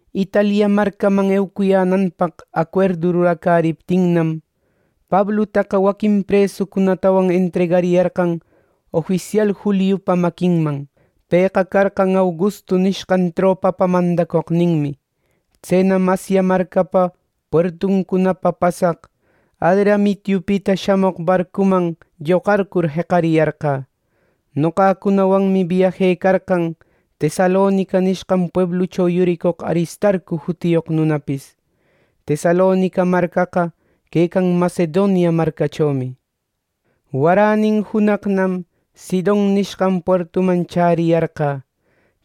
Italia marcaman eucuyänanpaq acuerdu ruracäriptinnam, Pablutaqa waquin presucunatawan entregariyarqan ofisial Juliupa maquinman. Pëqa carqan Augustu nishqan tropapä mandacoqninmi. Tsenam Asia marcapa puertuncunapa pasaq Adramitiupita shamoq barcuman lloqarcur jeqariyarqä. Noqacunawanmi biajecarqan Tesalonica nishqan pueblucho yuricoq Aristarcu jutiyoq nunapis. Tesalonica marcaqa quecan Macedonia marcachomi. Waränin junaqnam Sidon nishqan puertuman chäriyarqä.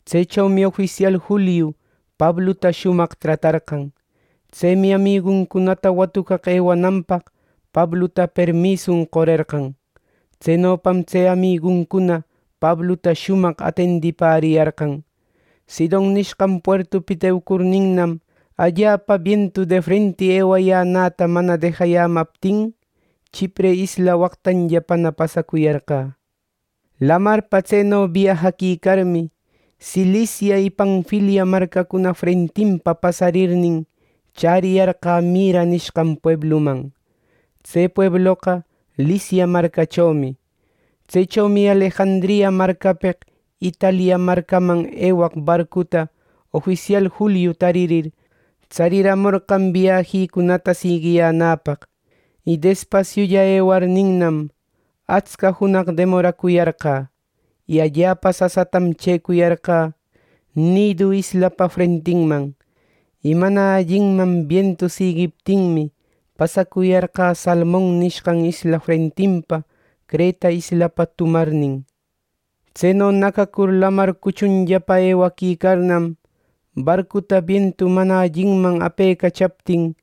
Tsechomi ofisial Juliu Pabluta shumaq tratarqan. Tsemi amiguncunata watucaq ewananpaq Pabluta permisun qorerqan. Tsenopam tse amiguncuna Pabluta shumaq atendipäriyarqan. Sidon nishqan puertupita eucurninnam, allapa bientu defrenti ewayänäta mana dejayämaptin Chipre isla waqtanllapana pasacuyarqä. Lamarpa tseno biajaquicarmi, Cilicia y Panfilia marcacuna frentinpa pasarirnin chäriyarqä Mira nishqan puebluman. Tse puebloqa Licia marcachomi. Tsechomi Alejandria marcapeq Italia marcaman ewaq barcuta ofisial Juliu taririr, tsariramorqan biajicunata siguiyänäpaq. Y despasiulla ewarninnam, atsca junaq demoracuyarqä. Y allapa sasatam chëcuyarqa Cnidu islapa frentinman. Y mana allinman bientu siguiptinmi, pasacuyarqä Salmon nishqan isla frentinpa Creta islapa tumarnin. Tseno nacacur lamar cuchunllapa ewaquicarnam, barcuta bientu mana alliman apecachaptin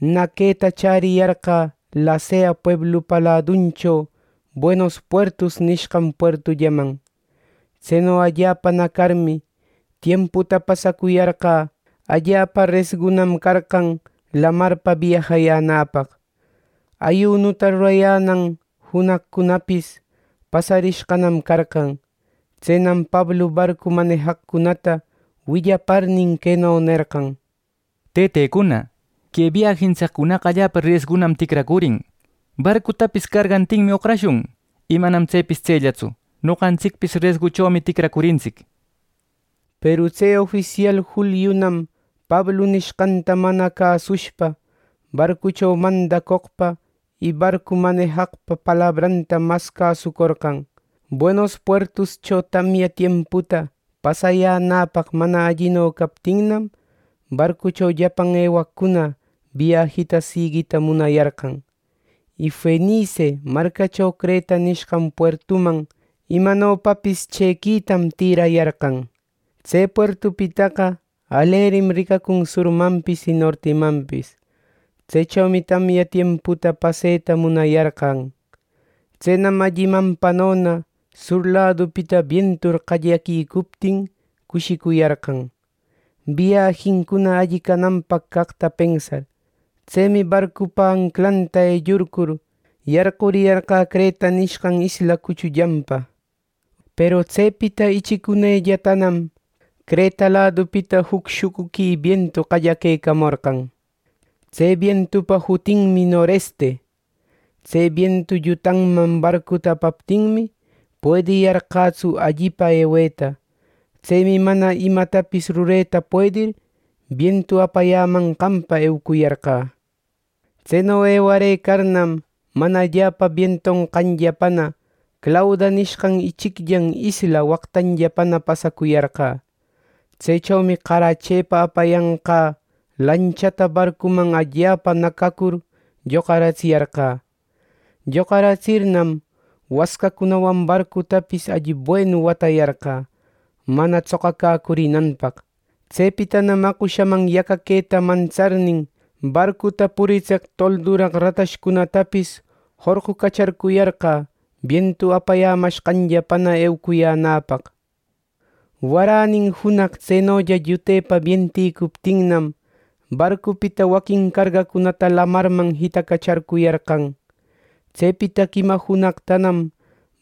naqueta chäriyarqä Lasea pueblupa laduncho Buenos Puertos nishqan puertullaman. Tseno allapa nacarmi, tiemputa pasacuyarqä allapa resgunam carqan lamarpa biajayänäpaq. Ayunuta rurayänan junaqcunapis pasarishqanam carqan. Tsenam Pablu barcu manejaqcunata willaparnin, queno nerqan: —Tëtecuna, que biajintsiccunaqa allapa resgunam ticracurin, barcutapis cargantinmi oqrashun, y manam tsepis tsellatsu, noqantsicpis resguchomi ticracurintsic —nishpa. Peru tse ofisial Juliunam Pablu nishqanta mana cäsushpa, barcucho mandacoqpa y barcu manejaqpa palabranta mas cäsucorqan. Buenos Puertoscho tamya tiemputa pasayänäpaq mana allino captinnam, barcucho llapan ewaqcuna biajita seguita munayarqan. Y Fenice marcacho Creta nishqan puertuman imanopapis chëquitam tirayarqan. Tse puertupitaqa alerim ricacun surmanpis y nortimanpis. Tsechomi tamya tiemputa paseta munayarqan. Tsenam allimanpanona sur ladupita bientur qallaquicuptin cushicuyarqan, biajincuna alli cananpaq caqta pensar. Tsemi barcupa anclanta ellurcur yarquriyarqä Creta nishqan isla cuchullanpa. Peru tsepita ichic unellatanam Creta ladupita juc shucuqui bientu qallaquecamorqan. Tse bientupa shutin noreste. Tse bientu llutanman barcuta apaptinmi, puediyarqätsu allinpa eweta. Tsemi mana imatapis rureta puedir, bientu apayämanqanpa eucuyarqä. Tseno ewarëcarnam, mana allapa bientonqanllapana Clauda nishqan ichicllan isla waqtanllapa pasacuyarqä. Tsechomi qarachepa apayanqä lanchata barcuman allapa nacacur lloqaratsiyarqä. Lloqaratsirnam, wascacunawan barcutapis alli buenu watayarqä, mana tsoqacäcurinanpaq. Tsepitanam aqoshaman yacaqueta mantsarnin, barcuta puritseq tolduraq ratashcunatapis jorqucacharcuyarqä bientu apayämashqanllapana eucuyänäpaq. Waranin junaq tsenolla llutepa bientïcuptinnam, barcupita waquin cargacunata lamarman jitacacharcuyarqan. Tsepita quima junaqtanam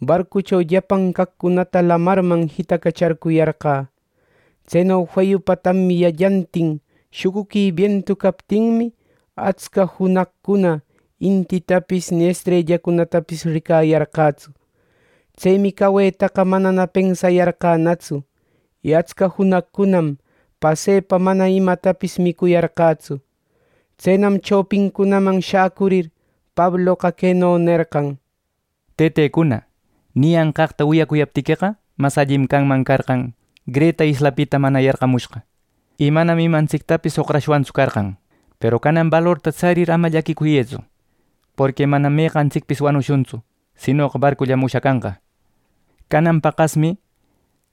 barcucho llapan caqcunata lamarman jitacacharcuyarqä. Tseno feyupa tamyallantin shucuqui bientu captinmi, atsca junaqcunana intitapis ni estrellacunatapis ricayarqätsu. Tsemi cawetaqa manana pensayarqänatsu. Y atsca junaqcunanam pasepa mana imatapis micuyarqätsu. Tsenam chopicunaman shacurir Pabloqa queno nerqan: —Tëtecuna, niyanqaqta wiyacuyaptiqueqa mas allim canman carqan, Creta islapita mana yarqamushqa, y manam imantsictapis oqrashwantsu carqan. Peru canan balorta tsarir ama llaquicuyëtsu, porqui manam meqantsicpis wanushuntsu sinoqa barcullam ushacanqa. Canan paqasmi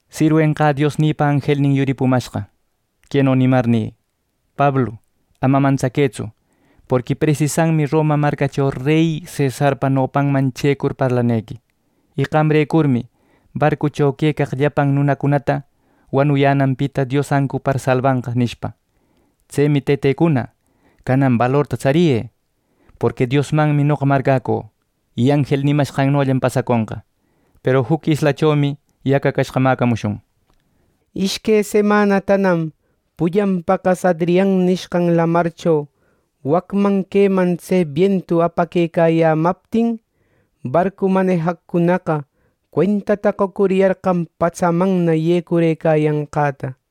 sirwenqä Diosnïpa anjelnin yuripumashqa, queno nimarnï: ‘Pablu, ama mantsaquëtsu; porqui presisanmi Roma marcacho rey cesarpa nopanman chëcur parlanequi. Y qamrecurmi barcucho quecaq llapan nunacunata wanuyänanpita Dios ancupar salbanqa’ nishpa. Tsemi tëtecuna, canan balorta tsariyë; porqui Diosmanmi noqa marcäcü. Y anjel nimashqannollam pasaconqa. Peru juc islachomi yacacashqa mäcamushun. Ishque semanatanam pullan paqas Adrian nishqan Lamarcho wacman queman tse bientu apaquecayämaptin, barcu manejaqcunaqa cuentata qocuriyarqan patsamanna yecurëcayanqäta.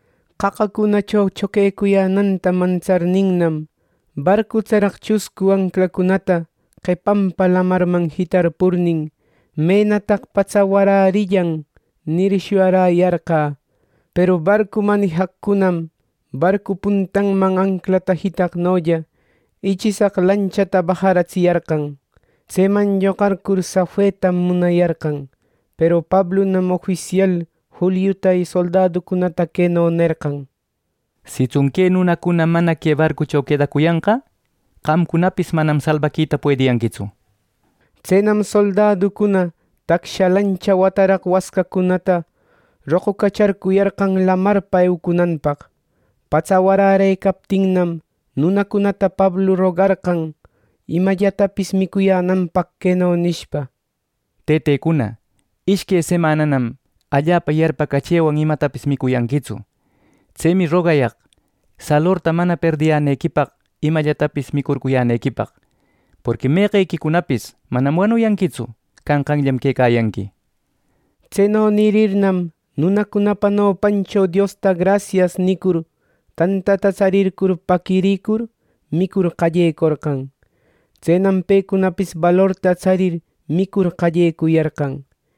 Qaqacunacho choquecuyänäta mantsarninnam, barcu tsaraq chuscu anclacunata qepanpa lamarman jitarpurnin ‘¡menataq patsa warärillan!’ nir, shuyayarqä. Peru barcu manijaqcunam barcu puntanman anclata jitaqnolla ichishaq lanchata bajaratsiyarqan. Tseman lloqarcur safetam munayarqan. Peru Pablunam ofisial Juliuta y soldaducunata queno nerqan: —Sitsun que nunacuna mana que barcucho quedacuyanqa, qamcunapis manam salbaquita puediyanquitsu —nishpa. Tsenam soldaducuna tacsha lancha wataraq wascacunata roqucacharcuyarqan lamarpa eucunanpaq. Patsa warärëcaptinnam, nunacunata Pablu rogarqan imallatapis micuyänanpaq queno nishpa: —Tëtecuna, ishque semananam allapa yarpacachëwan imatapis micuyanquitsu. Tsemi rogayaq salorta mana perdiyänequipaq imallatapis micurcuyänequipaq. Porqui mequequicunapis manam wanuyanquitsu. Canqanllam quecayanqui. Tseno nirirnam, nunacunapa nopancho Diosta grasias nïcurir, tantata tsarircur paquiricur, micur qallecorqan. Tsenam pecunapis balorta tsarir micur qallecuyarqan.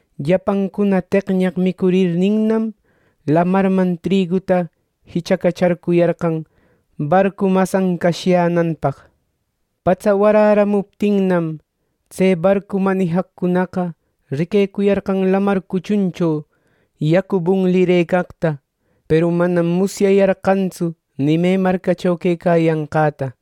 Llapancuna teqñaq micurirninnam, lamarman triguta jichacacharcuyarqan barcu mas ancashyänanpaq. Patsa waräramuptinnam, tse barcu manijaqcunaqa riquecuyarqan lamar cuchuncho yacu bunlirëcaqta peru manam musyayarqantsu ni me marcacho quecayanqäta.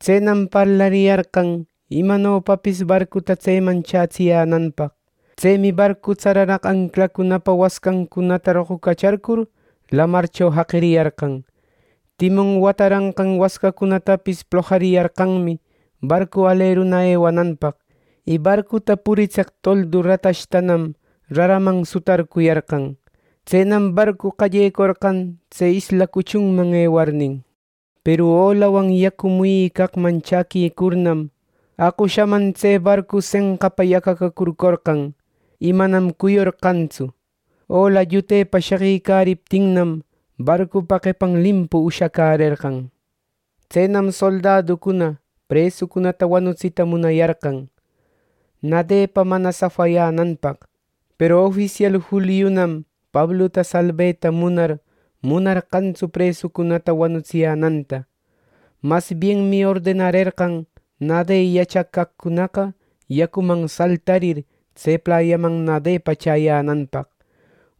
Tsenam parlariyarqan imanopapis barcuta tseman chätsiyänanpaq. Tsemi barcu tsararaq anclacunapa wascancunata roqucacharcur lamarcho jaqiriyarqan. Timon wataraq wascacunatapis plojariyarqanmi barcu aleru ewananpaq, y barcuta puritseq toldu ratashtanam raraman sutarcuyarqan. Tsenam barcu qallecorqan tse isla cuchunman ewarnin. Peru olawan yacu muyicaqman chaquicurnam, aqoshaman tse barcu senqapa yacacacurcorqan y manam cuyorqantsu. Ola llutepa sheqicariptinnam, barcupa qepan limpu ushacärerqan. Tsenam soldaducuna presucunata wanutsita munayarqan, nadepa mana safayänanpaq. Peru ofisial Juliunam Pabluta salbeta munar munarqantsu presucunata wanutsiyänanta. Masbienmi ordenarerqan nade yachaq caqcunaqa yacuman saltarir tse playaman nadepa chäyänanpaq.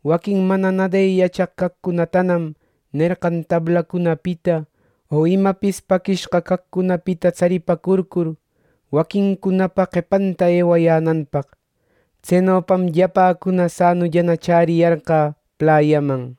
Waquin mana nade yachaq caqcunatanam nerqan tablacunapita o imapis paquishqa caqcunapita tsaripacurcur, waquincunapa qepanta ewayänanpaq. Tsenopam llapäcuna sanulla chäriyarqä playaman.